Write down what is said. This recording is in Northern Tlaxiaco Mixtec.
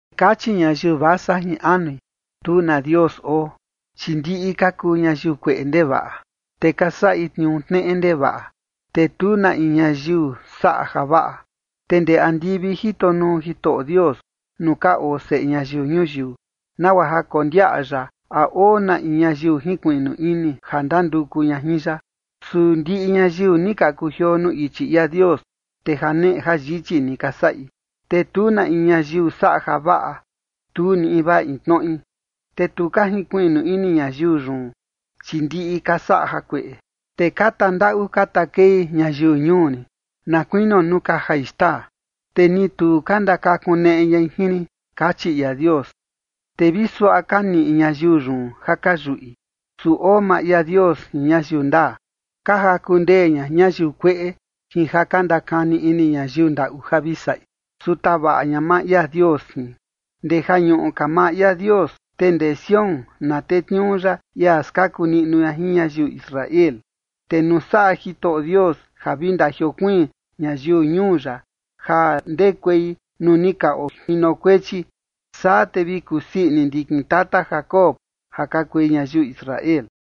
Kachi ñayiu vasa jin anui: “Tu na Dios oo”. Chi ndiꞌi ka kuu ñayiu kueꞌe ndevaꞌa, te ka saꞌi tniuu tneꞌe ndevaꞌa, te tu na in ñayiu saꞌa javaꞌa. Te ndee andivi jito nuu Jitoꞌo Dios nuu ka oo seꞌe ñayiu ñuyiu, nagua ja kondiaꞌa ya a oo na in ñayiu jinkuiꞌnu ini, ja ndanduku ña jin ya. Su ndiꞌi ñayiu ni ka kujioo nuu ichi ia Dios, te janeꞌe jayichi ni ka saꞌi, te tu na in ñayiu saꞌa javaꞌa, tu ni invaa in tnoꞌi. “Te tu ka jinkuiꞌnu ini ñayiu yun, chi ndiꞌi ka saꞌa jakueꞌe, te ka tandaꞌu ka takei ñayiu ñuu rin, na kuinio nuu ka jai xtaa, te ni tu ka ndakakuneꞌe ñai jin rin”, kachi ia Dios. Te vi suaꞌa ka niꞌi ñayiu yun ja ka yuꞌi, su oo maa ia Dios jin ñayiu ndaa. Ka jaku ndee ña ñayiu kueꞌe jin ja ka ndakani ini ñayiu ndaꞌu ja vi saꞌi, su tavaꞌa ña maa ia Dios jin. Ndee ja ñuꞌu ka maa ia Dios, te ndee Sión na tetniuu ya ia skaku niꞌnu ña jin ñayiu Israel. Te nuu saꞌa Jitoꞌo Dios ja vi ndajiokuiin ñayiu ñuu ya ja ndekuei nuu ni ka ojinokuechi, saa te vi kusii ini ndikin tata Jacob ja ka kui ñayiu Israel.